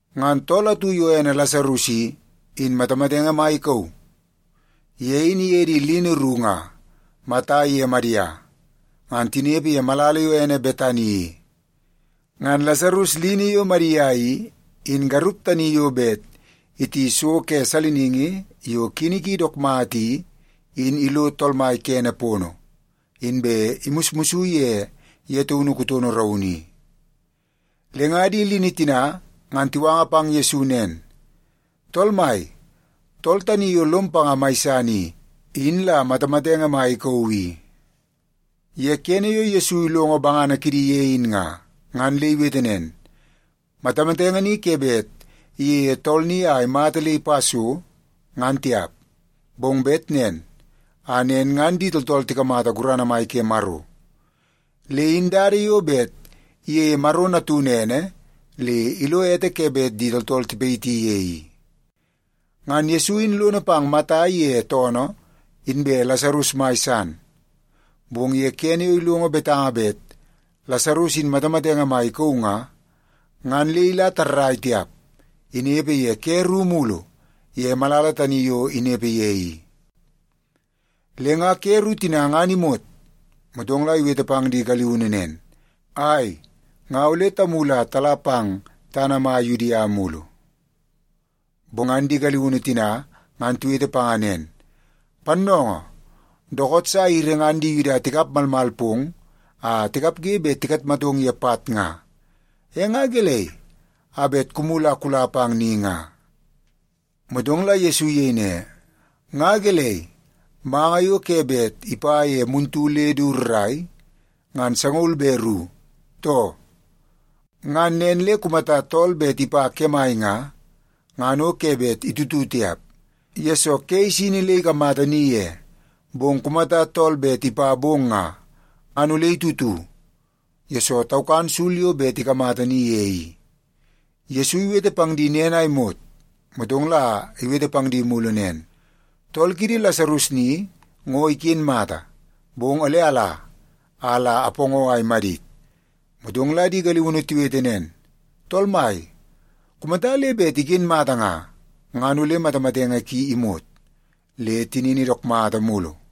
Ngan tool atu yo ene Lasarus i, in matamatenge mai ikauu. Ye in iye di lini ru nga Mata iye Madia, ngan tinepe ye malala yo ene Betani i. Ngan Lasarus lini yo Madia i, in garup tani yo bet iti so ke saliningi yo kini ki dook mata i, in ilo Tool Mai kene pono, inbe imusmus ye ye taunu kutono raunu i. Le nga di lini tina ngan tiwanga pang Yesu nen, “Tool Mai, tool tani yo lom panga mai san i, in la matamatenge mai ikauu i.” Ye kene yo Yesu ilongo bangana kidi ye in nga, ngan le iwete nen, “Matamatenge ni ke bet iyeie tool ni a imata le ipa so, ngan tiap. Bong bet nen a nen ngan di tooltool tikamata gurana mai ke Maro. Le in dada yo bet iyeie Maro Natunu ene le ilo ete ke bet di tooltool tipayiti ye i.” Ngan Yesu in lono pang Mata iye toonoo inbe Lasarus mai san, bong ye kene yo ilongo betanga bet Lasarus in matamatenge mai ikauu nga, ngan le ila tarrai tiap. Inepe ye ke ru mulu ye malala tani yo inepe ye i. Le nga ke ru tina ngan imot, motong la iwete pang di galiunu nen, “Ai, nga ole tamulu a tala pang tana mai Yudia mulu.” Bong ngan di galiunu tina ngan tiwete panga nen, “Pannoongoo, dookoot sa airi ngan di Yuda tikap malmal pong a tikapge bet tikatmatong ye pat nga. E nga gelei a bet kumulu a kula pang ni nga?” Motong la Yesu iyei ne, “Nga gelei, manga yo ke bet ipa ye muntu le du rrai, ngan sangaul be ru, too? Ngan nen le kumata tool bet ipa kemai nga, ngan o ke bet itutu tiap, yesoo ke isini le ikamata ni ye. Bong kumata tool bet ipa bong nga, ngan ole itutu, yesoo taukan sul yo bet ikamata ni ye i.” Yesu iwete pang di nen a imot, motong la iwete pang di mulu nen, “Tool kiidi Lasarus ni ngo iken mata. Bong ole ala, a la apoongoo a imadit.” Motong la di galiunu tiwete nen, “Tool Mai, kumata le bet iken mata nga, ngan ole matamatenge ki imot, le tinini dook mata mulu.”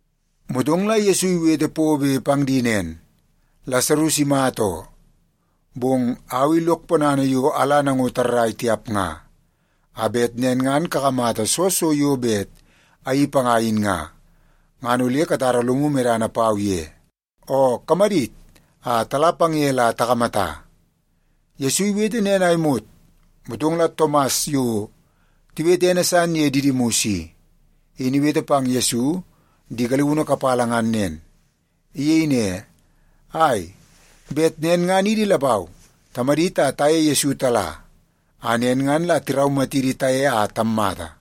Motong la Yesu iwete pobe pang di nen, “Lasarus imata oo, bong au i lok ponana yo ala nango tarrai tiap nga, a bet nen ngan kakamata soo so yo bet ayeii panga in nga, ngan ole katara lomu medana pau ye. Oo, kamadit a tala pang ye la takamata.” Yesu iwete nen a imot, motong la Tomas yo tiwete ene san ye Didimus i, in iwete pang Yesu di galiunu kapala ngan nen. Iyei ne, “Ai, bet nen ngan idi lapau tamadit a taye Yesu tala, a nen ngan la tiraumatidi taye a tammata.”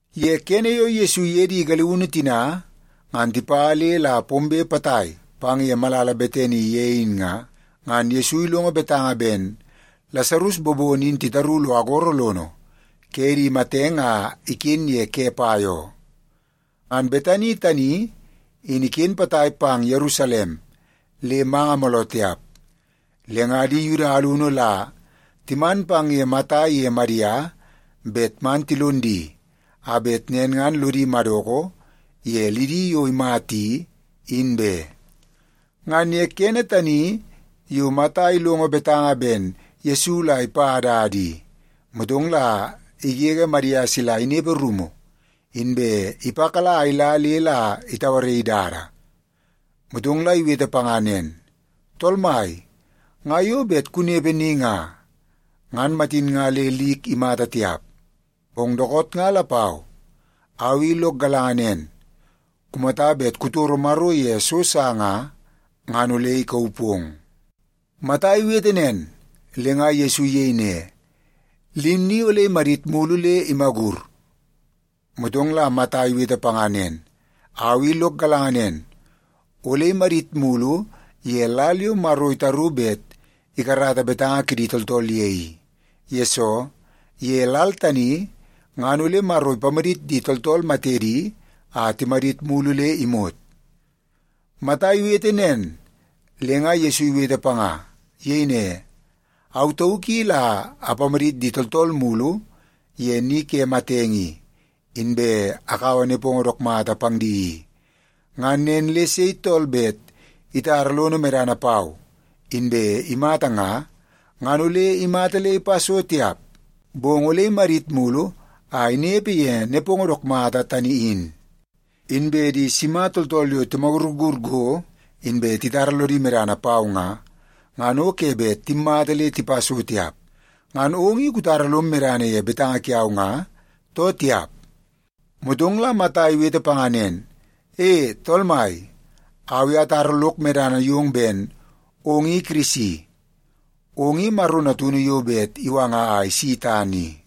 Ye kene yo Yesu iye di galiunu tina ngan tipa le la pombe potai pang ye malala Betani ye in nga, ngan Yesu ilongo betanga ben Lasarus bobono in titaru lo agoro lono ke di matenge a iken ye ke pai oo. Ngan Betani tani in iken potai pang Yerusalem le manga mooloo tiap. Le nga di Yuda alunu la timan pang ye Mata iye Madia bet man tilon di a bet nen ngan lodi madoko ye lidi yo imata i, in be. Ngan ye kene tani yo Mata ilongo betanga ben Yesu la ipa dada i, motong la igege Madia sila inepe rumu, inbe ipakala a ila le la itauaraii dada. Motong la iwete panga nen, “Tool Mai, nga yo bet kunepe ni nga, ngan matin nga le lik imata tiap. Bong dookoot nga lapau, au i lok galanga nen, kumata bet kutoro Maro ye so sa nga, ngan ole ikauu pong.” Mata iwete nen, le nga Yesu iyei ne, “Lim ni ole imadit mulu le imagur.” Motong la Mata iwete panga nen, “Au i lok galanga nen, ole imadit mulu ye lal yo Maro itaru bet ikarata betanga kidi tooltool ye i. Yesoo, ye lal tani ngan ole Maro ipamadit di tooltool matedi a timadit mulu le imot.” Mata iwete nen, le nga Yesu iwete panga. Iyei ne, “Au tauk i la apamadit di tooltool mulu ye ni ke matenge i, inbe akaua nepongo dook mata pang di i. Ngan nen le sei tool bet itara lono medana pau inbe imata nga, ngan ole imata le ipa so tiap, bong ole imadit mulu a inepe ye nepongo dook mata tani in. Inbe di sima tooltool yo timagurgur go, inbe titara lodi medana pau nga, ngan o ke bet timmata le tipa so tiap. Ngan ong i kutara lom medana ye betanga kiau nga, too tiap?” Motong la Mata iwete panga nen, “E, Tool Mai, au i atara lok medana yong ben ong i Kirisi. Ong i Maro Natunu yo bet iwanga a isi tana i.”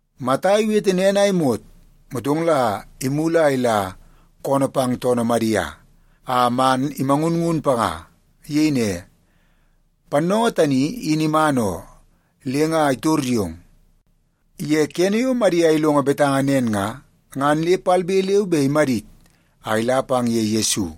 Mata iwete nen a imot, motong la imulu a ila koonoo pang toonoo Madia a man imangunngun panga. Iyei ne, “Pannoongoo tani in iman oo, le nga itor yong.” Ye kene yo Madia ilongo betanga nen nga, ngan le palbe leu be imadit a ila pang ye Yesu.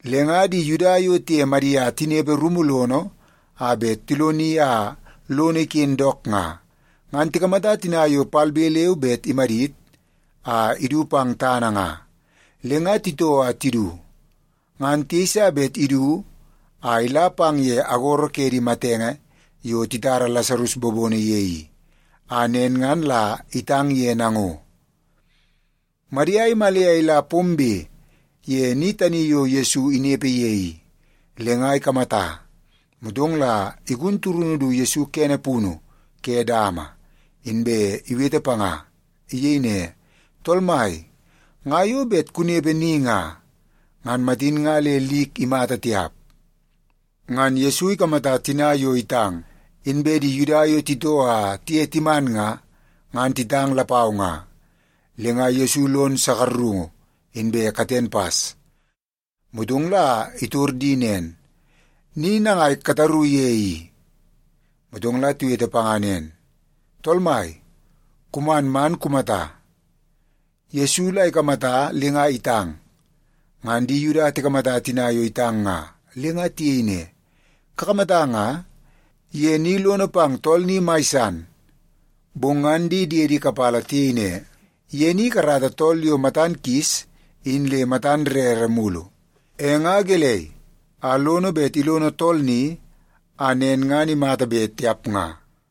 Le nga di Yuda yo tiye Madia tinepe rumu lono a bet tiloni a lono iken dook nga, ngan tikamata tina yo palbe leu be imadit a idu pang tana nga, le nga titoo a tidu. Ngan tiyeisa bet idu a ila pang ye agoro ke di matenge yo titara Lasarus bobono ye i, a nen ngan la itang ye nango. Madia imale a ila pombe ye ni tani yo Yesu inepe ye i, le nga ikamata, motong la igun turunu du Yesu kene punu ke dama, inbe iwete panga. Iyei ne, “Tool Mai, nga yo bet kunepe ni nga, ngan matin nga le lik imata tiap.” Ngan Yesu ikamata tina yo itang, inbe di Yuda yo titoo a tiye timan nga, ngan titang lapau nga, le nga Yesu lon sakarungu inbe katen pas. Motong la itor di nen, “Ni nangai kataru ye i?” Motong la tiwete panga nen, “Tool Mai, kuman man kumata.” Yesu la ikamata le nga itang. Ngan di Yuda tikamata tina yo itang nga, le nga tiyei ne, “Kakamata nga, ye ni lono pang tool ni mai san.” Bong ngan di diedi kapala tiyei ne, “Ye ni ikarata tool yo matan kis in le matan rere mulu, e nga gelei a lono bet ilono tool ni a nen ngan imata be, tiap nga?”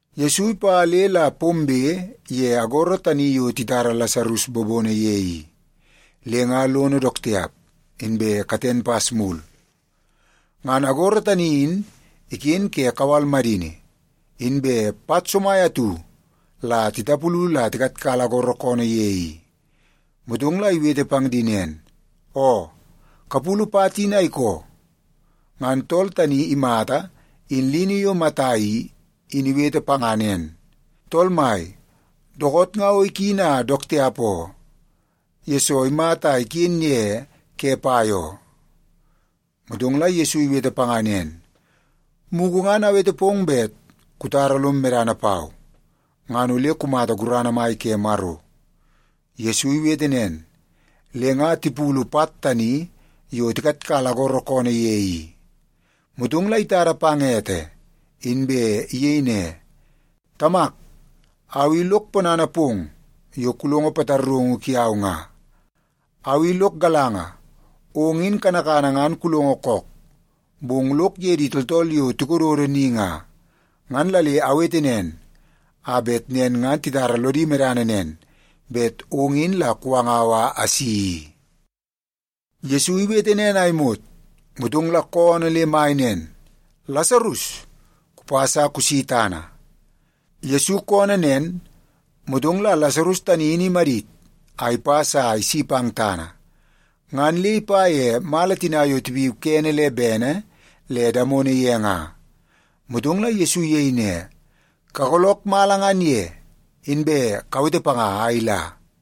Yesu ipa le la pombe ye agoro tani yo titara Lasarus bobono ye i, le nga lono dook tiap, inbe katen pas mulu. Ngan agoro tani in iken ke kawal madini. Inbe pat somai atu la titapulu la tikatkala agoro koonoo ye i. Motong la iwete pang di nen, “Oo, kapulu pat in a ikoo.” Ngan tool tani imata in lini yo Mata i, in iwete panga nen, “Tool Mai, dookoot nga o ikini a dook tiap oo, yesoo imata a iken ye ke pai oo.” Motong la Yesu iwete panga nen, “Mugu ngan awete pong bet kutara lom medana pau, ngan ole kumata gurana mai ke Maro.” Yesu iwete nen, le nga tipulu pat tani yo tikatkala agoro koonoo ye i. Motong la itada pang ete, inbe iyei ne, “Tamak, au i lok ponana pong yo kulongo pataraungu kiau nga. Au i lok galanga, ong in kanakana ngan kulongo kook. Bong lok ye di tooltool yo tikododo ni nga, ngan la le awete nen, a bet nen ngan titara lodi medana nen, bet ong in la kuwangau a asi i.” Yesu iwete nen a imot, motong la koonoo le mai nen, “Lasarus, kupas a kusi tana!” Yesu koonoo nen, motong la Lasarus tani in imadit a ipas a isi pang tana. Ngan le ipa ye mala tina yo tipiu kene le bene le damono ye nga. Motong la Yesu iyei ne, “Kagoolook mala ngan ye, inbe kawete panga a ila.”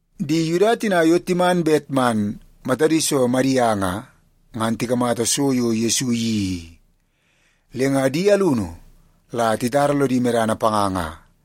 Di Yuda tina yo timan bet man matadi so Madia nga, ngan tikamata so yo Yesu iyeii i, le nga di alunu la titara lodi medana panga nga.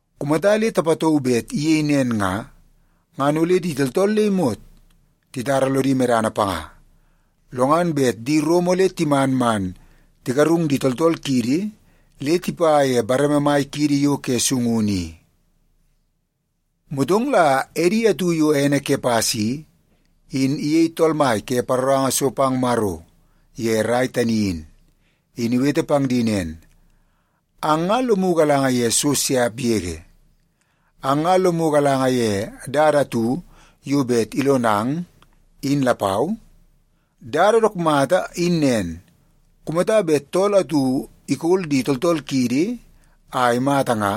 Kumata le tapatauu bet iyei nen nga, ngan ole di tooltool le imot titara lodi medana panga. Lo ngan bet di Rom ole timan man tigarung di tooltool kiidi le tipa ye bareme mai kiidi yo ke sungunu i.” Motong la edi atu yo ene Kepas i, in iyei tool mai ke paroranga so pang Maro ye rai tani in, in iwete pang di nen, “Ang nga lomu galanga ye so siap yege! Ang nga lomu galanga ye dada atu yo bet ilonang, in lapau? Dada dook mata in nen: Kumata bet tool atu ikol di tooltool kiidi a imata nga,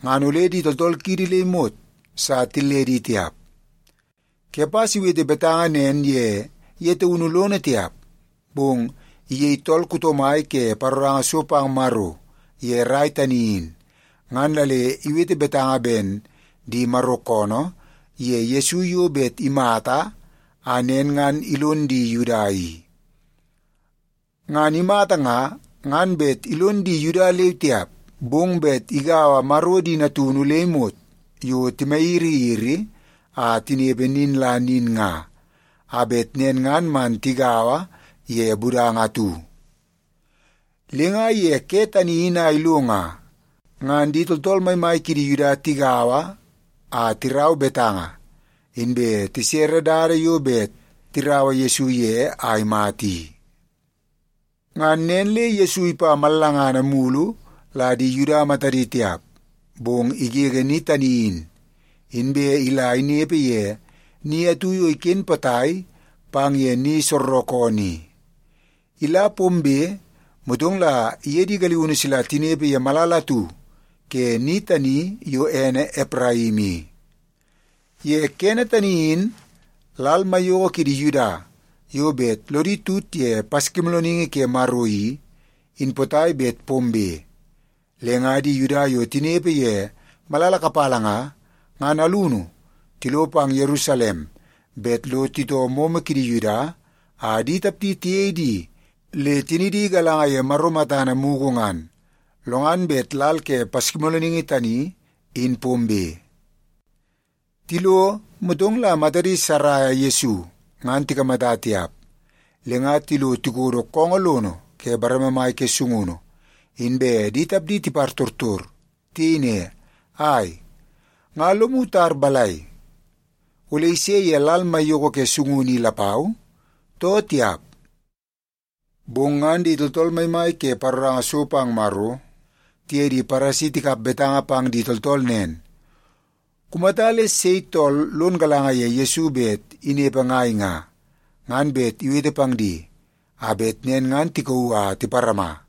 ngan ole di tooltool kiidi le imot sa tilledi tiap.” Kepas iwete betanga nen ye ye taunu lono tiap, bong iyei tool kuto mai ke paroranga so pang Maro ye rai tani in, ngan la le iwete betanga ben di Maro koonoo ye Yesu yo bet imata a nen ngan ilon di Yuda i. Ngan imata nga, ngan bet ilon di Yuda leu tiap, bong bet igaua Maro di natunu le imot yo timayiriyiri a tinepe nin la nin nga, a bet nen ngan man tigaua ye budanga atu. Le nga ye ke tani in a ilo nga, ngan di tooltool maimai kidi Yuda tigaua a tirau betanga, inbe tisere dada yo bet tiraua Yesu ye a imata i. Ngan nen le Yesu ipa mallangana mulu la di Yuda matadi tiap, bong igege ni tani in, inbe ila inepe ye ni atu yo iken potai pang ye ni soorookoonoo i. Ila pombe, motong la iye di galiunu sila tinepe ye malala atu ke ni tani yo ene Epraim i. Ye kene tani in lal maiyoko kidi Yuda yo bet lodi tut ye Paskimoolooningi ke Maro i, in potai bet pombe. Le nga di Yuda yo tinepe ye malala kapala nga, ngan alunu tilo pang Yerusalem bet lo titoo momo kidi Yuda a di tapdi tiyei di le tinidi galanga ye Maro matana mugu ngan, lo ngan bet lal ke Paskimoolooningi tani in pombe. Tilo, motong la matadi saraia Yesu, ngan tikamata tiap. Le nga tilo tikodo koongoo lono ke bareme mai ke sungunu, inbe di tapdi tipartortor. Tiyei ne, “Ai, nga lomu tar balai? Ole ise ye lal maiyoko ke sungunu i lapau, too tiap?” Bong ngan di tooltool maimai ke paroranga so pang Maro tiye di Paresi tikap betanga pang di tooltool nen, kumata le sei tool lon galanga ye Yesu bet inepe ngai nga, ngan bet iwete pang di a bet nen ngan tikauu a tiparama.